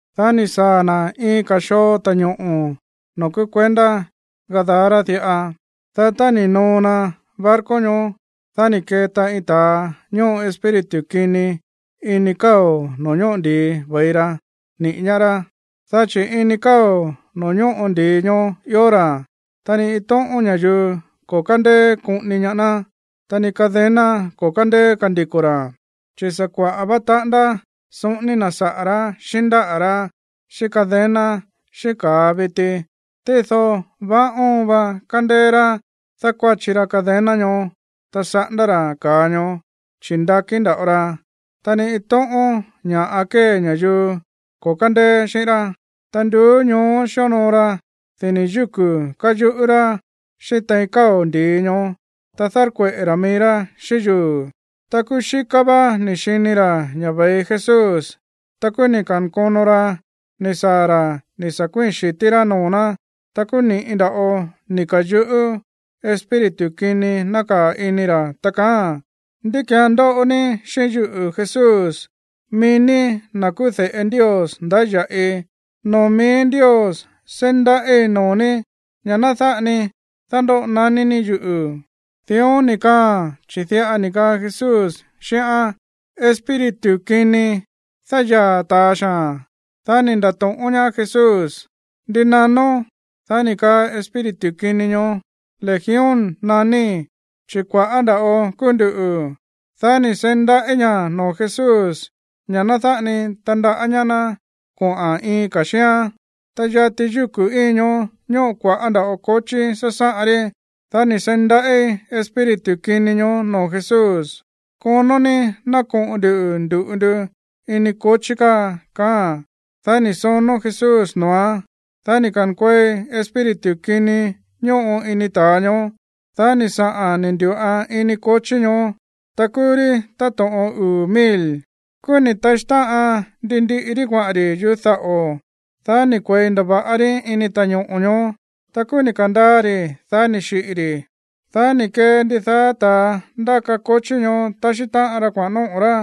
Dá ni̱ saa̱ na̱ iin ka̱ xoo ta̱ñoꞌo̱ noo̱ kúú kuendá Gadara diꞌa. Dá tá ni̱ noo na barco ñoó, dá ni̱ keta iin ta̱a ñóꞌo espíritu kini ini káo̱ no̱ó ñóꞌo ndi̱i ve̱i ra niꞌi̱ ñaá rá. Dá chi̱ ini káo̱ noo̱ ñóꞌo ndi̱i ñoó ió ra̱. Ta ni iin tóꞌón ña̱yuu ko̱ kándeé koꞌoni ñaá ná, ta ni cadena ko̱ kándeé kandiko̱ ra̱, chi̱ sa̱ kuaꞌa̱ vá taꞌándá soꞌóní na̱ saꞌa̱ rá xíꞌín ndáꞌa̱ rá xíꞌín cadena, xíꞌín ka̱a viti. Tído vaá óon va kándéé rá dákuáchi ra cadena ñoó, ta saꞌándá ra̱ ka̱a ñoó, chi̱ ndakí nda̱ꞌo ra. Ta ni iin tóꞌón ña̱ꞌa kée ña̱yuu ko̱ kándeé xíꞌín rá. Ta nduú ñoó xíonoo ra dini̱ yúku̱ káyuꞌú rá xíꞌín tein káo̱ ndi̱i ñoó, ta dárkueꞌe̱ ra̱ mií rá xíꞌín yuu̱. Ta kúú xíká vá ni̱ xini ra̱ ña̱ ve̱i Jesús. Ta kúú ni̱ ka̱nkono ra ni̱ saa̱ ra̱ ni̱ sa̱ kuíi̱n xi̱tí rá noo̱ ná. Ta kúú ni̱ꞌi nda̱ꞌo ni̱ ka̱yuꞌú espíritu kini nákaa̱ ini ra̱, ta kaáa̱n: ―¿Ndi ki̱án ndóꞌo ní xíꞌín yuꞌu̱, Jesús, mií ní na̱ kúú de̱ꞌe Ndios ndáya̱ꞌi? ¡Noo̱ míí Ndios seí ndaꞌíi̱ noo̱ ní ña̱ ná dáꞌa ni dándóꞌo naní ní yuꞌu̱! Dión ni̱ kaáa̱n, chi̱ diꞌa ni̱ kaa Jesús xíꞌán: ―¡Espíritu kini, dáyaa̱ ta̱a xaa̱n! Dá ni̱ nda̱to̱ꞌón ñaá Jesús: ―¿Ndi nanón? Dá ni̱ kaa espíritu kini ñoó: ―Legión naníí, chi̱ kua̱ꞌá nda̱ꞌo kúú nduꞌu̱. Dá ni̱ seí ndaꞌí ña̱ noo̱ Jesús ña̱ ná dáꞌa ni tandaꞌá ñaá ná koꞌa̱n iin ka̱ xíán. Ta yati yúku̱ íin ñoó ñóꞌo kua̱ꞌá nda̱ꞌo kochí sásáꞌan rí. Dá ni̱ seí ndaꞌí espíritu kini ñoó noo̱ Jesús: ―Konó ní ná koꞌo̱n ndu̱ ndu̱ꞌu ndu ini kochí káa ―kaáa̱n. Dá ni̱ sonó Jesús noo̱án. Dá ni̱ ka̱nkuei espíritu kini ñóꞌo ini ta̱a ñoó. Dá ni̱ saꞌa̱n ni̱ ndu̱ꞌan ini kochí ñoó. Ta kúú rí táto̱ꞌon uu̱ mil. Kúú ni̱ taxí táꞌan ndi ndiꞌi rí kuaꞌa̱n ri̱ yuꞌú daꞌo̱. Dá ni̱ kue̱i ndava̱ꞌa rí ini ta̱ñoꞌo̱ ñoó. Ta kúú ni̱ ka̱ndaa ri̱, dá ni̱ xiꞌi̱ ri̱. Dá ni̱ kee ndidaá ta̱a ndáka kochí ñoó taxí táꞌan ra kuaꞌa̱n nóꞌo̱ ra̱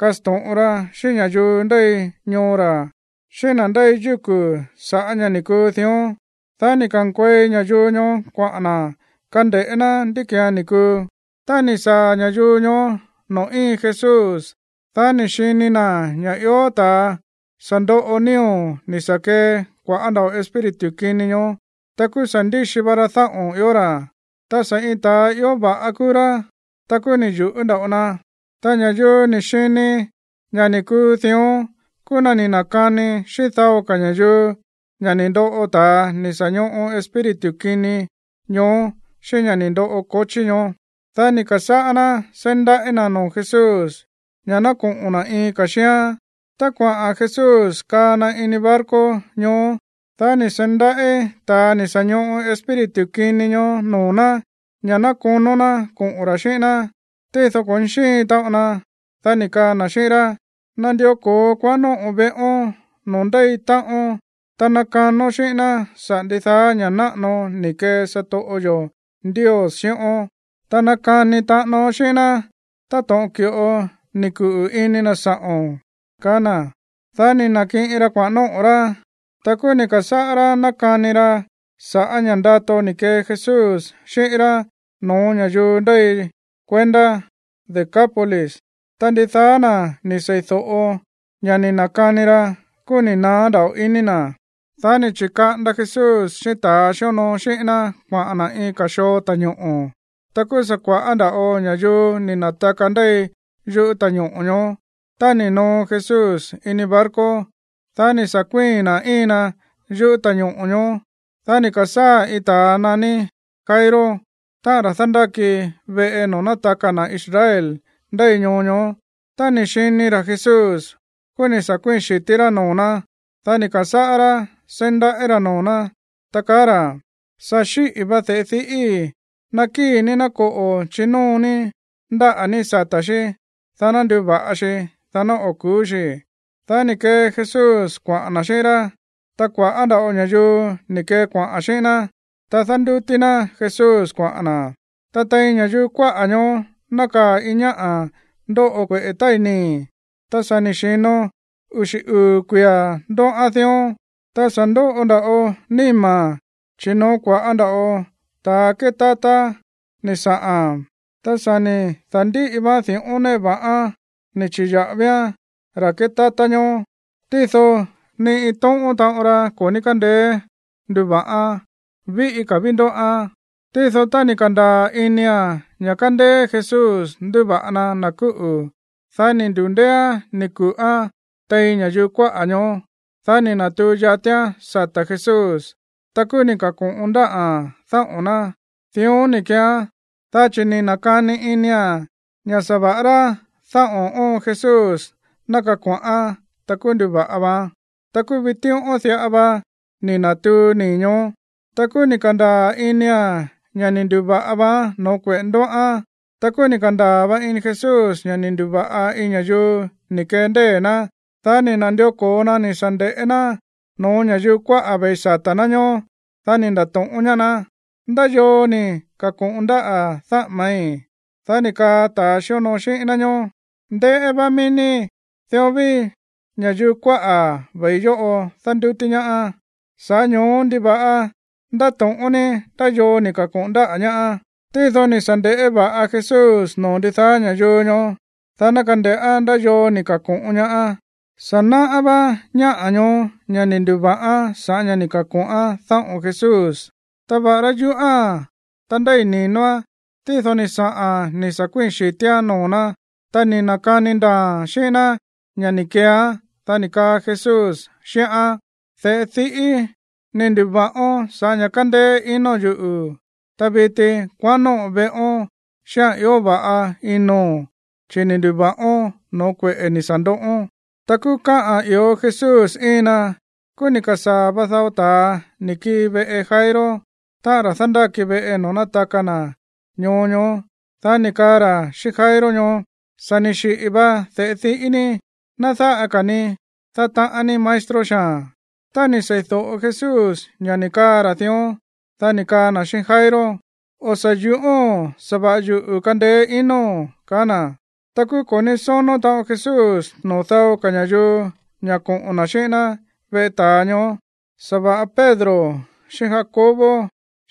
kasto̱ꞌon ra xíꞌín ña̱yuu ndéi ñoo ra̱, xíꞌín na̱ ndéi yúku̱ saꞌa̱ ña̱ ni̱ kuu dión. Dá ni̱ ka̱nkuei ña̱yuu ñoó kuaꞌa̱n na̱ kande̱ꞌé ná ndi ki̱án ni̱ kuu. Tá ni̱ saa̱ ña̱yuu ñoó noo̱ íin Jesús, dá ni̱ xini na̱ ña̱ ió ta̱a sa̱ ndoꞌo nío̱ ni̱ sa̱ kee kua̱ꞌá nda̱ꞌo espíritu kini ñoó. Ta kúú sa̱ ndíxi va ra dáꞌo̱n ió ra̱. Ta sa̱ iin ta̱a ió va̱ꞌa kúú rá. Ta kúú ni̱ yu̱ꞌú nda̱ꞌo na. Ta ña̱yuu ni̱ xini ña̱ ni̱ kuu dión kúú na̱ ni̱ na̱kani xíꞌín dao ka̱ ña̱yuu ña̱ ni̱ ndoꞌo ta̱a ni̱ sa̱ ñoꞌo espíritu kini ñoó xíꞌín ña̱ ni̱ ndoꞌo kochí ñoó. Dá ni̱ ka̱sáꞌá ná seí ndaꞌí na̱ noo̱ Jesús ña̱ ná koꞌo̱n na̱ iin ka̱ xíán. Tá kuaꞌa̱n Jesús kaa na ini barco ñoó, dá ni̱ seí ndaꞌí ta̱a ni̱ sa̱ ñoꞌo espíritu kini ñoó noo̱ ná ña̱ ná konó ná koꞌo̱n ra̱ xíꞌín ná. Tído ko̱ ní xíin taꞌon na. Dá ni̱ kaa na̱ xíꞌín rá: ―Nandió ko̱ón kuaꞌán nóꞌo̱n veꞌón noo̱ ndéi táꞌón, ta nakanón xíꞌín ná saꞌa̱ ndidaá ña̱ náꞌano ni̱ kee satoꞌo yo̱ Ndios xíꞌón, ta nakani taꞌánón xíꞌín ná táto̱ꞌon ki̱ꞌo ni̱ kuꞌu̱ ini na̱ sa̱ꞌo̱n ―ka̱á na̱. Dá ni̱ na̱kiꞌin ra kuaꞌa̱n nóꞌo̱ rá. Ta kúú ni̱ ka̱sáꞌá rá nákani ra sa̱ꞌá ña̱ ndato ni̱ kee Jesús xíꞌín rá no̱ó ña̱yuu ndéi kuendá Decápolis. Ta ndidaá na̱ ni̱ seídóꞌo ña̱ ni̱ na̱kani ra, kúú ni̱ naá nda̱ꞌo iní na̱. Dá ni̱ chi̱kaꞌanda Jesús xíꞌín ta̱a xíonoo xíꞌín ná kuaꞌa̱n na̱ iin ka̱ xoo ta̱ñoꞌo̱. Ta kúú sa̱ kua̱ꞌá nda̱ꞌo ña̱yuu ni̱ na̱taka ndéi yuꞌú ta̱ñoꞌo̱ ñoó. Tá ni̱ noo Jesús ini barco, dá ni̱ sa̱ kuíi̱n na̱ íin na yuꞌú ta̱ñoꞌo̱ ñoó. Dá ni̱ ka̱sáa̱ iin ta̱a naní Jairo, táꞌa̱n ra̱ dándáki veꞌe noo̱ nátaka na̱ Israel ndéi ñoo ñoó. Tá ni̱ xini ra̱ Jesús, kúú ni̱ sa̱ kuíi̱n xi̱tí rá noo̱ ná. Dá ni̱ ka̱sáꞌá rá seí ndaꞌí ra̱ noo̱ ná, ta kaá ra̱: ―Sa̱ xíꞌi̱ va de̱ꞌe diꞌíi̱. Nakíi̱ ní ná koꞌo̱ chinóo ní ndáꞌa̱ ní sata̱ xí, dá ná nduva̱ꞌa xi, dá ná o̱ ku̱ú xi. Dá ni̱ kee Jesús kuaꞌa̱n na̱ xíꞌín rá. Ta kua̱ꞌá nda̱ꞌo ña̱yuu ni̱ kee kuaꞌa̱n xíꞌín ná, ta dándútí ná Jesús kuaꞌa̱n na̱. Ta tein ña̱yuu kuáꞌa̱ ñoó nákaa̱ iin ñáꞌa̱ ndóꞌo kueꞌe̱ tái̱ nii̱, ta sa̱ ni̱ xi̱no uxi̱ uu̱ kuia̱ ndóꞌán dión. Ta sa̱ ndoꞌo nda̱ꞌo níma̱n, chi̱ noo̱ kua̱ꞌá nda̱ꞌo ta̱a kétátá ni̱ saꞌa̱n. Ta sa̱ ni̱ da̱ndíꞌi vaán di̱ꞌón néꞌe va̱ꞌán ni̱ chi̱ya̱ꞌavián ra̱ kétátá ñoó. Tído ni iin tóꞌón taꞌon ra ko̱ ní kándeé nduva̱ꞌán. Víꞌí ka̱ ví ndóꞌán. Tído tá ni̱ ka̱ndaa̱ inia̱n ña̱ kándéé Jesús nduva̱ꞌa na na̱ kúꞌu̱, dá ni̱ ndu̱ndééán ni̱ ku̱ꞌán tein ña̱yuu kuáꞌa̱ ñoó. Dá ni̱ na̱tuu yatián sata̱ Jesús, ta kúú ni̱ ka̱ko̱ꞌon ndáꞌa̱n dáꞌo̱n ná. Dión ni̱ keeán, dá chi̱ ni̱ na̱kani inia̱n ña̱ sa̱va̱ꞌa rá dáꞌo̱n óon Jesús ná kako̱ꞌán, ta kúú nduva̱ꞌa vaán. Ta kúú vitíꞌón diꞌa va ni̱ na̱tuu nii̱ ñoó. Ta kúú ni̱ ka̱ndaa̱ inia̱n ña̱ ni̱ ndu̱va̱ꞌa vaán no̱ó kueꞌe̱ ndóꞌán. Ta kúú ni̱ ka̱ndaa̱ va ini Jesús ña̱ ni̱ ndu̱va̱ꞌa iin ña̱yuu ni̱ kee ndée̱ ná. Dá ni̱ na̱ndió ko̱o na ni̱ sa̱ nde̱ꞌé ná no̱ó ña̱yuu kuáꞌa̱ ve̱i sata̱ ná ñoó. Dá ni̱ nda̱to̱ꞌón ñaá ná: ―¿Ndá yoo ni̱ ka̱ko̱ꞌon ndáꞌa̱ dáꞌa̱ma̱í? Dá ni̱ kaa ta̱ xíonoo xíꞌín ná ñóó: ―Ndéꞌé vá mií ní, dión ví ña̱yuu kuáꞌa̱ ve̱i yóꞌo dándútí ñaá. Sa̱ꞌá ño̱ó, ¿ndiva̱ꞌa ndáto̱ꞌón ní ndá yoo ni̱ ka̱ko̱ꞌon ndáꞌa̱ ñaá? Tído ni̱ sa̱ nde̱ꞌé va̱ꞌa Jesús noo̱ ndidaá ña̱yuu ñoó, dá ná kande̱ꞌá ndá yoo ni̱ ka̱ko̱ꞌon ñaá. Sa̱ náꞌá vá ñáꞌa̱ ñoó ña̱ ni̱ ndu̱va̱ꞌán sa̱ꞌá ña̱ ni̱ ka̱ko̱ꞌán dáꞌo̱n Jesús. Ta va̱ꞌará yuꞌúa̱n, ta ndéi̱ ni̱noán, tído ni̱ saꞌa̱n ni̱ sa̱ kuíi̱n xi̱tíán noo̱ ná, ta ni̱ na̱kani ndaa̱a̱n xíꞌín ná ña̱ ni̱ keeán. Dá ni̱ kaa Jesús xíꞌán: ―De̱ꞌe diꞌíi̱, ni̱ ndu̱va̱ꞌón sa̱ꞌá ña̱ kándéé inóo̱n yuꞌu̱. Ta viti, kuaꞌán nóꞌo̱n veꞌón xíꞌa̱n ió va̱ꞌa inóo̱n, chi̱ ni̱ ndu̱va̱ꞌón no̱ó kueꞌe̱ ni̱ sa̱ ndoꞌón. Ta kúú káꞌa̱n i̱íó Jesús íin na, kúú sa̱ ni̱ ka̱sáa̱ va dao ta̱a ni̱ kii veꞌe Jairo, táꞌa̱n ra̱ dándáki veꞌe noo̱ nátaka na̱ ñoo ñoó. Dá ni̱ kaa ra̱ xíꞌín Jairo ñoó: ―Sa̱ ni̱ xiꞌi̱ va de̱ꞌe diꞌí ní. Ná dáꞌa ka̱ ní dátaꞌán ní maestro xaa̱n. Tá ni̱ seídóꞌo Jesús ña̱ ni̱ kaꞌa̱n ra̱ dión, dá ni̱ kaa na̱ xíꞌín Jairo: ―O̱ sa̱ yúꞌóo̱n. Sa̱va̱ꞌa yuꞌu̱ kandeé inóo̱n ―kaá na̱. Ta kúú ko̱ ní sónó taꞌon Jesús noo̱ dao ka̱ ña̱yuu ña̱ koꞌo̱n na̱ xíꞌín ná veꞌe ta̱a ñoó, sa̱va̱ꞌa Pedro xíꞌín Jacobo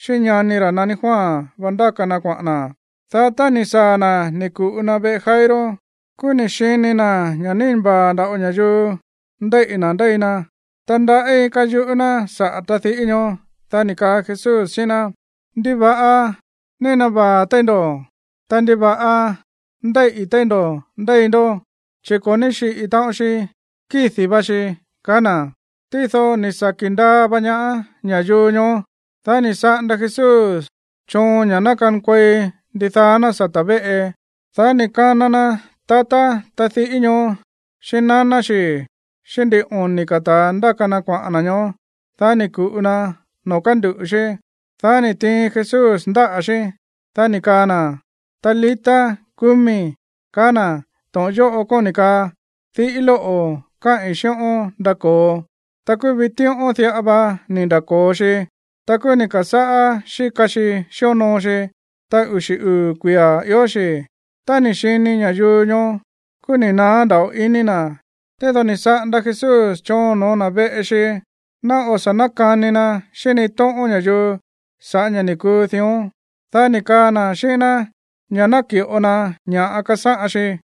xíꞌín ñani ra̱ naní Juan va ndáka na kuaꞌa̱n na̱. Dá tá ni̱ saa̱ na̱ ni̱ ku̱ꞌu na veꞌe Jairo, kúú ni̱ xini na̱ ña̱ nína vaa̱ nda̱ꞌo ña̱yuu ndéíꞌi̱ na̱ ndéi na, ta ndaꞌí káyuꞌú ná saꞌa̱ tadiꞌí ñoó. Dá ni̱ kaa Jesús xíꞌín ná: ―¿Ndiva̱ꞌa nína vaa̱ téí ndo̱? Ta, ¿ndiva̱ꞌa ndéíꞌi̱ téí ndo̱ ndéi ndó? Chi̱ ko̱ ní xíꞌi̱ taꞌon xi, kídi̱ va xi ―kaá na̱. Tído ni̱ saki̱ ndaa va ñaá ña̱yuu ñoó. Dá ni̱ saꞌanda Jesús choon ña̱ ná kankuei ndidaá ná sata̱ véꞌe. Dá ni̱ kana na tatá tadiꞌí ñoó xíꞌín naná xi̱ xíꞌín ndin oni̱ ka̱ ta̱a ndáka na kuaꞌa̱n na̱ ñoó. Dá ni̱ ku̱ꞌu na noo̱ kánduꞌu̱ xí. Dá ni̱ tiin Jesús ndáꞌa̱ xí. Dá ni̱ kaa na̱: ―Talita, cumi ―ka̱á na̱. To̱ꞌon yóꞌo kóni̱ kaa: Diꞌí lóꞌo̱, káꞌi̱n xíꞌón, ndako̱o. Ta kúú vitíꞌón diꞌa vá ni̱ nda̱ko̱o xi. Ta kúú ni̱ ka̱sáꞌá xíka xi xíonoo xi. Ta uxi̱ uu̱ kuia̱ ió xi. Tá ni̱ xini ña̱yuu ñoó, kúú ni̱ naá nda̱ꞌo iní na̱. Tído ni̱ saꞌanda Jesús choon no̱ó na̱ veꞌe xi ná o̱ sa̱ nákani na xíꞌín ni iin tóꞌón ña̱yuu sa̱ꞌá ña̱ ni̱ kuu dión. Dá ni̱ kaa na̱ xíꞌín ná ña̱ ná ki̱ꞌo na ña̱ꞌa kasáꞌan xi.